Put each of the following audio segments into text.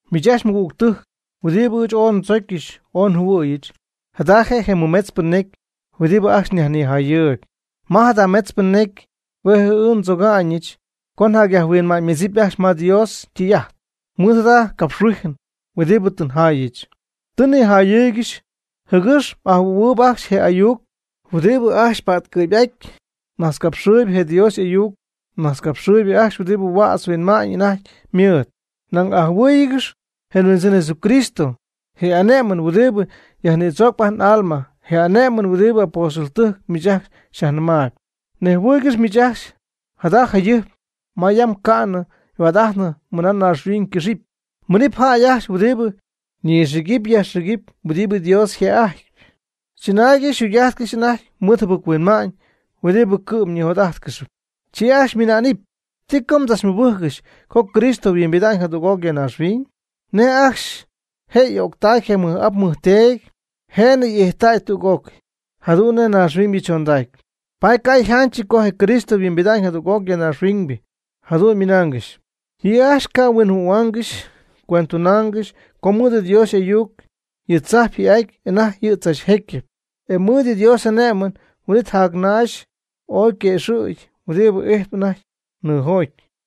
Miich ajcxy mɨgügtɨjc huɨdibɨ ɨɨch ooy ndzocyɨch ooy njɨhuɨ̈yɨch, jada je' je mɨmetzpɨ necy huɨdibɨ ajcxy nyajnijayɨɨyb. Ma jada metzpɨ necy hue' ɨɨch ndzoga'ñɨch co nyajhuinma'ñymedzip ajcxy ma Dios ytɨy'ajt mɨɨd jada capxhuijɨn huɨdibɨ tɨ njaayɨch. Tɨ nnijayɨɨygɨxy jɨgɨx m'ajɨhuɨ̈huɨɨyb ajcxy je ayuc huɨdibɨ ajcxy pa'tcɨ̈py'aty ñajtzcapxɨɨy je Dios y'ayucnajtzcapxɨɨybɨ ajcxy huɨdibɨ huädz yhuinma'ñ anajty ymɨɨd. Nañ ajɨhuɨ́ɨyɨgɨx je Huindzɨn Jesucristo je' y'ane'mɨn huɨdibɨ yajnïdzoocp ajt n'alma, je ane'mɨn huɨdibɨ apóstoltɨjc miich ajcxy xyajnɨmaayb. Nejhuɨɨygɨxy miich ajcxy jada jayɨjp ma yam ca'nɨ yhuaad'ajtnɨ mɨna naaxhuiñ ycɨxɨpy, miinɨp jäy ajcxy huɨdibɨ nixïgɨp yajxïgɨp huɨdibɨ Dios yjë'ajtpy. Chɨnaaygɨxy yjugy'ajtcɨxy anajty mɨɨd jɨbɨc-huinma'ñ huɨdibɨ cɨ'm ñijot'ajtcɨxyp. Chi ajcxy ymɨna'nɨp: “¿Ti co mdzachmɨbɨjccɨxy co Cristo yhuimbida'ñ jadüg'oc ya naaxhuiñ? Nej ajcxy je' y'o'ctay je mɨj'ap je mɨjteedy, je'nɨ y'ijttäy tüg'ócɨy jadu'n nej naaxhuiñybɨ chondacy. Paady ca' yjanchɨty co je Cristo yhuimbida'ñ jadüg'oc ya naaxhuiñ,” jadu'n ymɨnaangɨxy. Yɨ' ajcxy ca' huinjɨhuɨ̈huaangɨxy cuendtunaangɨxy co mɨɨd Dios y'ayuc yɨ tzajp ji'ajtp anajty yɨ' tzachjecyɨp, e mɨɨd Dios y'ane'mɨn huin'it je naax oy yguëxɨ̈gy huɨdibɨ ijtp anajty nɨɨjoty.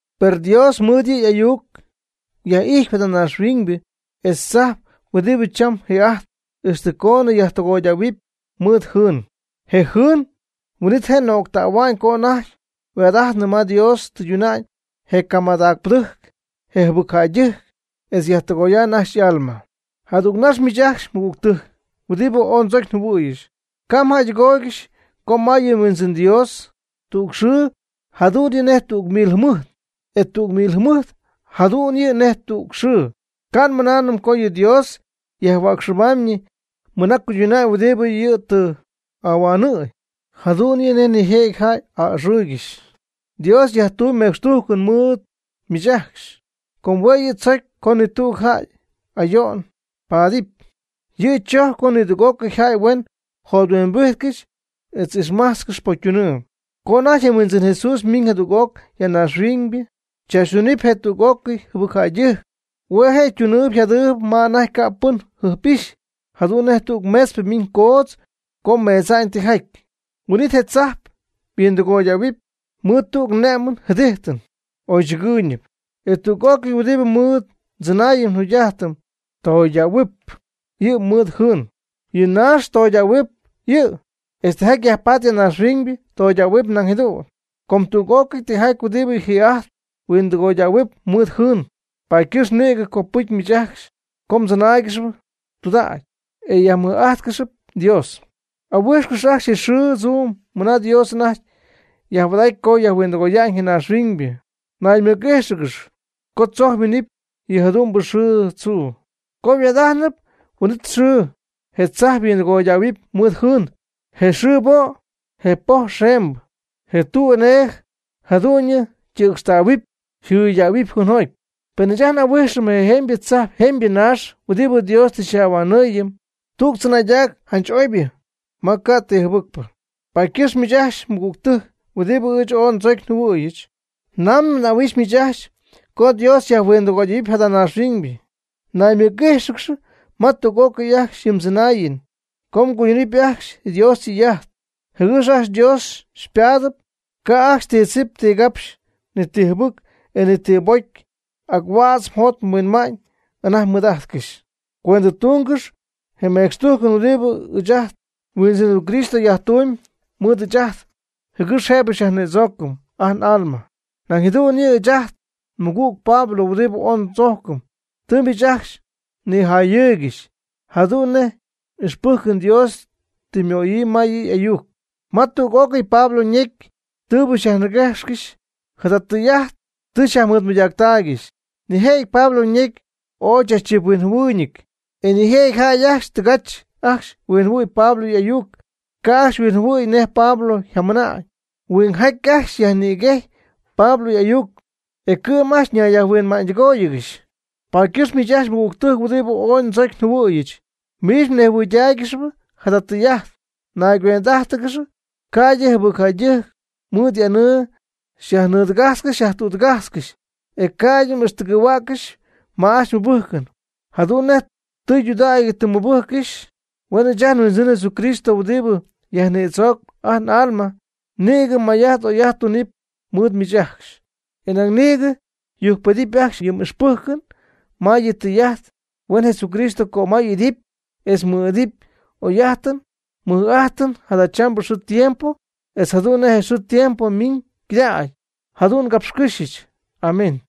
Per Dios mɨɨd yɨ' y'ayuc yaj'ijtpy jada naaxhuiñybɨ etz tzajp huɨdibɨ cham ji'ajtp ixtɨ coon yajtɨgoydähuɨpy mɨɨd jɨɨn. Je jɨɨn huin'it je' nöctähua'ñ co anajty yhuaad'ajtnɨ ma Dios tɨyduna'ñ je camadacpɨdɨjc je jɨbɨcjäydɨjc, etz yajtɨgoya'ñ ajcxy y'alma. Jadügnax miich ajcxy mɨgügtɨjc huɨdibɨ ooy ndzocy njɨhuɨ̈yɨch, ca' mjäydɨgooygɨxy co ma yɨ Huindzɨn Dios, tüg xɨɨ jadu'n yɨ' nej tüg mil jɨmɨjt, e tüg mil jɨmɨjt jadu'n yɨ' nej tüg xɨɨ. Ca' nmɨnaanɨm co yɨ Dios yajhuäcxɨbaamyñɨ yɨ' mɨna cuyduna'ñ huɨdibɨ yɨ' tɨ ahuanɨ̈y, jadu'n nej nijëjɨty jäy a'ɨxɨɨygɨxy. Dios yajtumyb mecxtujcɨn mɨɨd miich ajcxy, com hue' yɨ' tzocy co ni tüg jäy ayo'n paadɨpy. Yɨ' chojcpy co nidüg'ócɨy jäy huen jothuimbijtcɨxy etz ixmajtzcɨxy pocytunɨɨ. Co anajty je Huindzɨn Jesús ymiiñ jadüg'oc ya naaxhuiñybɨ chaachytunɨpy je' tüg'ócɨy jɨbɨcjäydɨjc, hue' je' ytunɨɨyb yjadɨɨyb ma anajty ca' pɨn jɨjp'ixy, jadu'n nej tüg meetzpɨ ymiiñ coodz co meedza'ñ tijaty. Huin'it je tzajp yhuindɨgoydähuɨpy mɨɨd tüg ne'mɨn jɨdijtɨn oychɨgɨɨyñɨp. E tüg'ócɨy huɨdibɨ mɨɨd ndzɨnaayɨm njugy'ajtɨm toydähuɨp yɨ' mɨɨd jɨɨn, yɨ naax toydähuɨp yɨ', etz tijaty yajpatp ya naaxhuiñ toydähuɨp nañ jadu'n. Com tüg'ócɨy tijaty huɨdibɨ ji'ajtp yhuindɨgoydähua'ñ mɨɨd jɨɨn, paady ycɨxpɨ nïgɨ copɨcy miich ajcxy co mdzɨnaaygɨxp tudägy e myajmɨj'ajtcɨxyp Dios. Ahuijxcɨx ajcxy je xɨɨ tzuu mɨna Dios anajty yajhuaad'aty co yajhuindɨgoya'ñ je naaxhuiñybɨ. Naymɨc'íjxɨgɨx co tzojc yminɨpy yɨ jadu'mbɨ xɨɨ tzuu. Co yhuaad'ajtnɨp huin'it xɨɨ, je tzajp yhuindɨgoydähuɨp mɨɨd jɨɨn; je xɨɨ po', je pojp xemembɨ, je tuu enee jadu'ñyɨ ytɨcxtähuɨpy yjɨydähuɨpy jɨɨnjoty. Per ɨɨch ajt n'ahuijxɨm je jemybɨ tzajp jemybɨ naax huɨdibɨ Dios tɨ xyaj'ahuanɨɨyɨm, tüg tzɨnaaydac janch'oybɨ ma ca' ti jɨbɨcpɨ. Paady ycɨxp miich ajcxy mɨgügtɨjc huɨdibɨ ɨɨch ooy ndzocyɨch njɨhuɨ̈yɨch, namɨ m'ahuijxyp miich ajcxy co Dios yajhuindɨgoyaanɨp jada naaxhuiñ, naymɨc'íjxɨgɨx ma tüg'ócɨy ajcxy yɨ mdzɨnaayɨn co mguydunɨpy ajcxy Dios ytɨy'ajt jɨgɨx ajcxy Dios xypaadɨpy, ca' ajcxy ti tzip ti gapxy, ni ti jɨbɨcpɨ, e ni ti pocy, ac huädz jot huädz huinma'ñ anajty mɨɨd'ajtcɨxy. Cuendɨtungɨx je mecxtujcɨn huɨdibɨ ɨɨch ajt nHuindzɨn Jesucristo yajtumyb mɨɨd ɨɨch ajt jɨgɨx jëbɨ xyajnïdzoocɨm ajt n'alma. Nañ jadu'n yɨ', ɨɨch ajt nmɨgüg Pablo huɨdibɨ ooy ndzojcɨm, tɨ miich ajcxy xyñijayɨɨygɨxy, jadu'n nej ixpɨjcɨn Dios tɨ ymöyii ma yɨ' y'ayuc. Ma tüg'ócɨy Pablo ñecy tɨɨbɨ xyajniguejxcɨxy, jada tɨy'ajt tɨ xyajmɨɨdmɨydaaccɨxy. Nijëjɨty Pablo ñecy ooy chachchiphuinjɨhuɨɨyñɨty, e nijëjɨty jäy ajcxy tɨgach ajcxy huinjɨhuɨ̈y Pablo y'ayuc, ca' ajcxy huinjɨhuɨ̈y nej Pablo yjamɨna'na'ñ. Huingjaty ajcxy nïguej Pablo y'ayuc, e cɨ'm ñayyajhuinma'ñydɨgóoyɨgɨxy. Paady ycɨxp miich ajcxy mɨgügtɨjc huɨdibɨ ooy ndzocy njɨhuɨ̈yɨch, miich mnejhuɨydaaygɨx jada tɨy'ajt. Nayguend'ájtɨgɨx ca'ydɨ jɨbɨcjäydɨjc mɨɨd y'anɨɨ xyajnɨɨdɨgajtzcɨxy xyajtüdɨgajtzcɨxy, e ca'ydɨ m'ixtɨgɨ̈huäccɨxy ma ajcxy mmɨbɨjcɨn jadu'n nej tɨydudägy tɨ mmɨbɨjccɨxy. Huen ɨɨch ajt nHuindzɨn Jesucristo huɨdibɨ yajnïdzoocp ajt n'alma nïgɨ may'ajt oy'ajt tunɨpy mɨɨd miich ajcxy, e nañ nïgɨ yujcpedɨpy ajcxy yɨ m'ixpɨjcɨn ma yɨ' ytɨy'ajt. Huen Jesucristo cömay y'idɨpy etz mɨ'idɨpy oy'ajtɨn mɨj'ajtɨn jadachambɨ xɨɨ tiempo etz jadu'n nej xɨɨ tiempo miimb cɨdacp. Jadu'n ngapxycɨ́xyɨch. Amén.